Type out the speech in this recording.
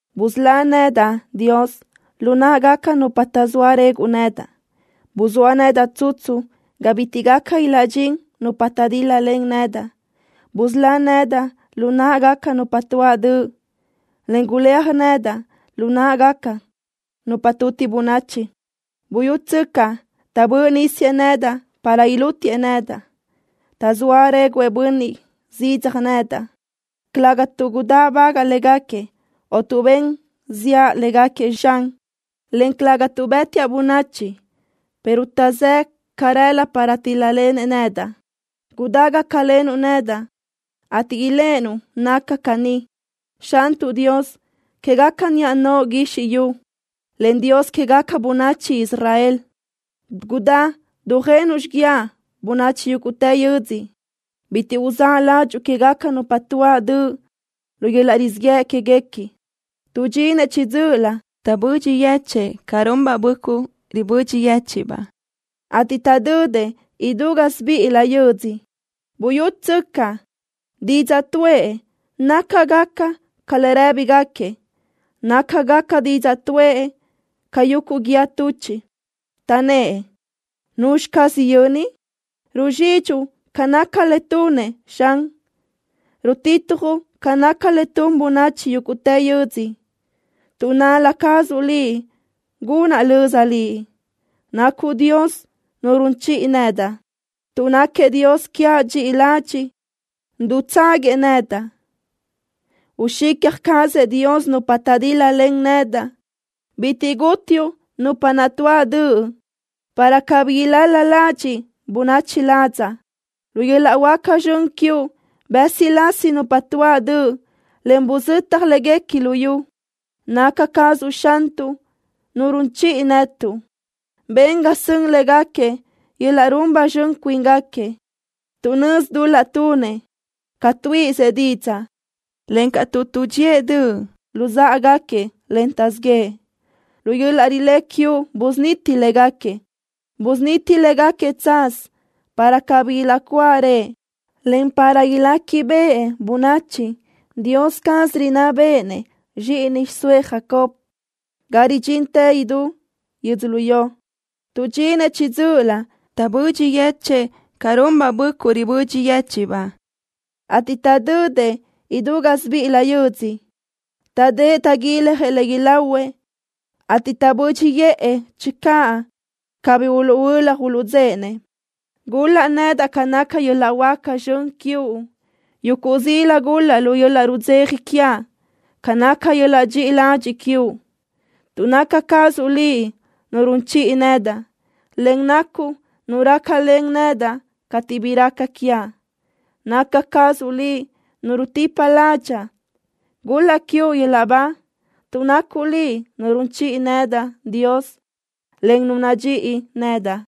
Busölá nedaʼ, Dios, lu náʼagaca nupa taʼzóa reguʼ nedaʼ. Buzóa nedaʼ tsutsu ga bitiʼ gaca ilaʼdxín nupa taʼdíl-lalen nedaʼ. Busölá nedaʼ lu náʼagaca nupa tuáʼ döʼ, en guléaj nedaʼ lu náʼagaca nupa tuti bönachi. Buyútsöcaʼ, taʼbö́ʼ nísiëʼ nedaʼ para ilútiëʼ nedaʼ. Taʼzóa réguʼë bönniʼ zidzaj nedaʼ, calëga tuʼ gudáʼbagaʼa légaquiëʼ, o tuʼ ben ziʼa légaquiëʼ, Xan, en calëga tuʼ bë́tiaʼ bönachi, pero taʼzë́ʼë carelö para tíl-lalenëʼ nedaʼ. Gudá gácalenuʼ nedaʼ, ateʼ iléʼenuʼ naca caní. Xantuʼ Dios quégaca niʼa noʼo guizxi yu, en Dios quégaca bönachi Israel, gudá dujenuʼ xiguiaʼ bönachi yúguʼtë yödzö. Bitiʼ uzáʼ ládxuʼu quégaca nupa tuáʼ döʼ lu yöl-laʼ rizíʼ yëʼ quéguequi. Tuʼdxinëʼ chiʼi dzö́ʼölö, taʼbödxi yechë́ʼë ca runbaʼ böʼcuʼ ragu yéchiʼbaʼ beoʼ, ateʼ taʼdödëʼ idú gásibiʼilö yödzö. Buyútsöcaʼ, didzaʼ tuʼë nácagaca ca le rë́bigaquiëʼ. Nácagaca didzaʼ tuʼë ca yuguʼ guíë tuchiʼ. Taʼnnë́ʼ: “¿Nuzxi caz yöni?” Ruzxidxuʼ ca naca le tunëʼ, Xan. Rutitjuʼ ca naca le tun bönachi yúguʼtë yödzö. Tuʼ nal-la cazuʼ Liʼ gunaʼ löza Liʼ. Nacuʼ Dios Nu run chiʼi nedaʼ. Tuʼ náquiëʼ Dios quiaʼ dxiʼi ladxiʼ, dutságuiëʼ nedaʼ. Uxicja cazëʼ Dios nupa taʼdíl-lalen nedaʼ. Bitiʼ gútiuʼ nupa naʼ tuáʼ döʼ para cabí ilal-la ladxiʼ bönachi ladzaʼ. Lu yöl-laʼ huáca zxön quiuʼ bë́silasi nupa tuáʼ döʼ, en buzötaj léguequi luyú. Naca cazuʼ Xantuʼ, Nu run chiʼi netuʼ. Ben ga sön légaquiëʼ yöl-laʼ run ba zxön cuíngaquiëʼ tuʼ nözi dul-laʼ tunëʼ ca tuíʼisëʼ didzaʼ, encaʼ tuʼ tuʼdxíëʼ döʼ luzáʼagaquiëʼ, en taʼzíʼ yëʼë. Lu yöl-laʼ rilé quiuʼ busuniti légaquiëʼ. Busuniti légaquiëʼ tsaz para cabí ilaʼcuáʼarëʼ, en para iléquibeʼe bönachi Dios caz rinná béʼenëʼ zxíʼini xiʼsóëʼ Jacob, ga ridxintë idútë yödzölió. Tuʼdxinëʼ chiʼi dzö́ʼölö, taʼbödxi yechë́ʼë ca runbaʼ böʼcuʼ ragu yéchiʼbaʼ beoʼ, ateʼ taʼdödëʼ idú gásibiʼilö yödzö. Taʼdë́ʼ taʼguiljëʼ le ilahuëʼ, ateʼ taʼbö́dxiʼë channö cabí uluʼhuölaj uluʼdzéʼenëʼ. Gul-laʼ nedaʼ ca naca yöl-laʼ huáca zxön quiuʼ. Yuguʼ zila gul-laʼ lu yöl-laʼ rudzeja quiaʼ ca naca yöl-laʼ dxiʼi ladxiʼ quiuʼ, tuʼ naca cazuʼ Liʼ Nu run chiʼi nedaʼ, en nacuʼ Nu rácalen nedaʼ cateʼ bi raca quiaʼ. ¡Naca cazuʼ Liʼ Nu rutipa ládxaʼa! ¡Gul-laʼ quiuʼ yöl-laʼ ba, tuʼ nacuʼ Liʼ Nu run chiʼi nedaʼ, Dios, en Nu nadxíʼi nedaʼ!